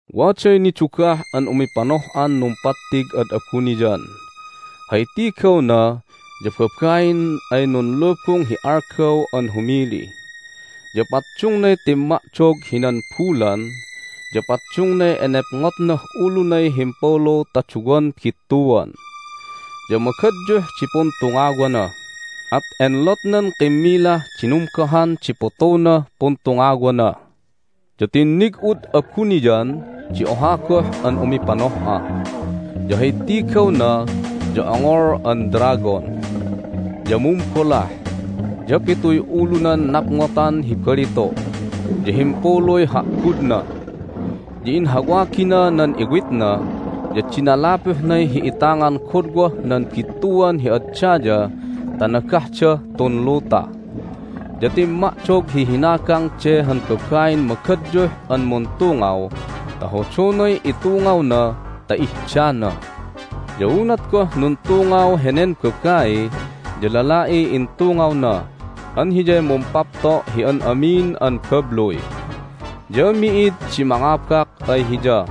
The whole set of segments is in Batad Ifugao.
Waday nidugah an umipanoh'an numpattig ad abuniyan. Hay tigawna ya babain ay nunlubung hi algaw an humili. Ya paddungnay timma'dog hinan bulan, ya paddungnay enepngotnah ulunay himpulu ta duwan bittuan. Ya magadyuh di puntungawana, at enlotnan kimmilah dinumgohan di putunah puntungawana. Ya tinnig'ud abuniyan di oha goh an umipanoh'a. Ya hay tigawna ya ongol an dragon. Ya mumbolah, ya pituy ulunan napngotan hi balitu', ya himpuluy ha'gudna. Ya inhawagina nan iwitna, ya dinalupuhnay hi'itangan godwah nan bittuan hi ad daya ta nagahdah tun luta. Ya timma'dog hi hinagang de han babain magadyuh an muntungaw ta hodonay itungawna ta ihdana. Ya unat goh nuntungaw henen babai ya lala'iy intungawna an Hiyay mumpapto' hi an amin an babluy. Ya mi'id di mangabak ay Hiya,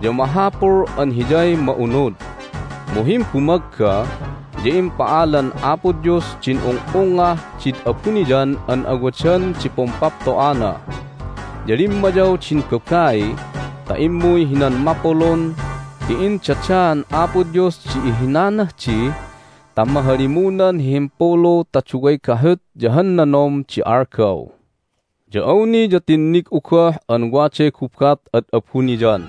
ya mahapul an Hiyay ma'unud. Mu himbumagga ya impa'alan Apo Dios din ung'ungngah did abuniyan an awadan di pumpapto'ana. Ya limmayaw din babai ta immuy hinan mapulun ti indadaan Apo Dios di ihinanah di ta mahalimunan hi himpulu ta duway gahut ya han nanom di algaw. Ya awni ya tinnig'u goh an waday gubat ad abuniyan.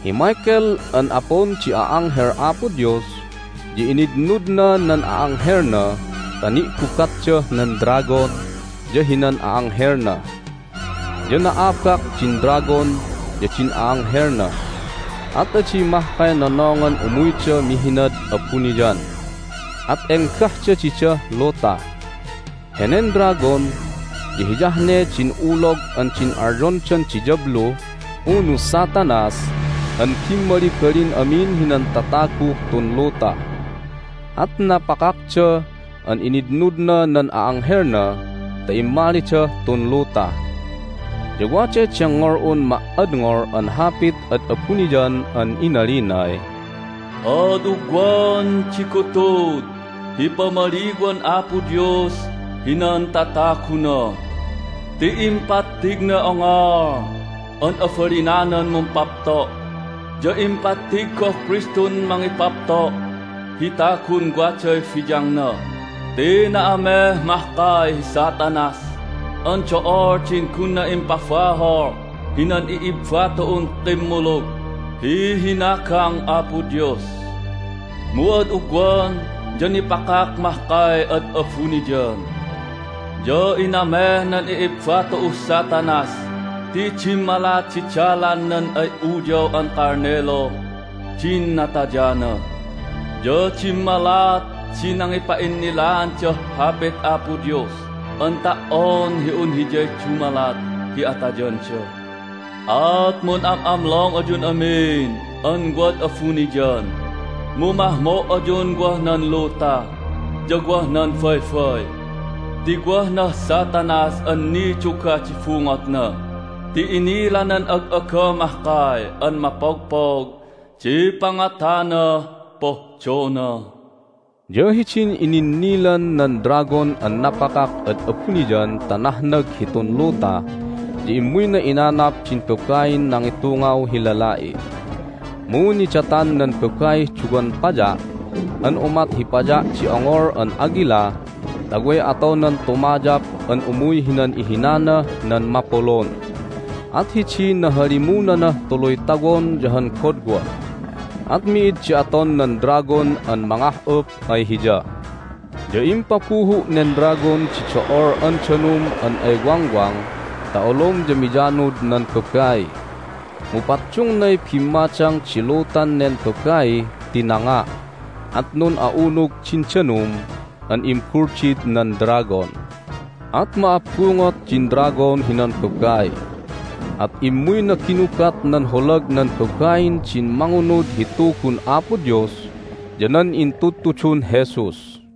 Hi Michael an apun di a'anghel Apo Dios ya initnudna nan a'anghelna ta ni'gubatdah nan dragon ya hinan a'anghelna. Ya na'abak din dragon ya din a'anghelna. At adi mahkay nonongan umuyda mihinad abuniyan, at enggahda didah luta. Henen dragon ya hiyah ne din ulog an din alyondan diyablu unu Satanas an bimmalibalin amin hinan tataguh tun luta. At napakakda an initnudna nan a'anghelna ta immalidah tun luta. Ya waday dengngol'un ma"adngol an hapit ad abuniyan an inalinay, "Ad ugwan di gutud hi pamaliwan Apo Dios hinan tataguna! Ti impattignay ongol an abalinanan mumpapto', ya impattig goh Kristun mangipapto' hi tagun waday biyangna ti na'ameh mahkay hi Satanas an do'ol din gunna impabahol hinan i'ibba tu'un kimmulug hi hinagang Apo Dios. Mu ad ugwan ya nipakak mahkay ad abuniyan. Ya inameh nan i'ibba tu'uh Satanas ti dimmalat di dalan nan ay Uyaw an Kalniluh din natayana, ya dimmalat di nangipa'innilaandah Hapit Apo Dios an ta"on hi un hiyay dumalat hi atayanda. At mun'am'amlong ayun amin an wad abuniyan! Mu mahmo' ayun wah nan luta ya wah nan baybay ti wah nah Satanas an nidugah di bungotna ti inilanan ag'aga mahkay an mapogpog di pangatanah pohdona." Ya hidin ininnilan nan dragon an napakak ad abuniyan ta nahnag hitun luta ya immuyna inanap din babain nangitungaw hi lala'i. Mu nidatan nan babaih duwan paya' an umat hi paya' di ongol an agila ta way atonan tumayap an umuy hinan ihinanah nan mapulun. At hidiy nahalimunanah tuluy tawon ya han godwa, at mi'id di aton nan dragon an mangah'up ay hiya. Ya impabuhu' nen dragon di do'ol an danum an ay wangwang ta olom ya miyanud nan babai. Mu paddungnay bimmadang di lutan nen babai ti nanga', at nun'a'unug din danum an imbuldid nan dragon. At ma'abbungot din dragon hinan babai, at immuyna ginubat nan holag nan babain din mangunud hi Tugun Apo Dios ya nan intudtudun Jesus.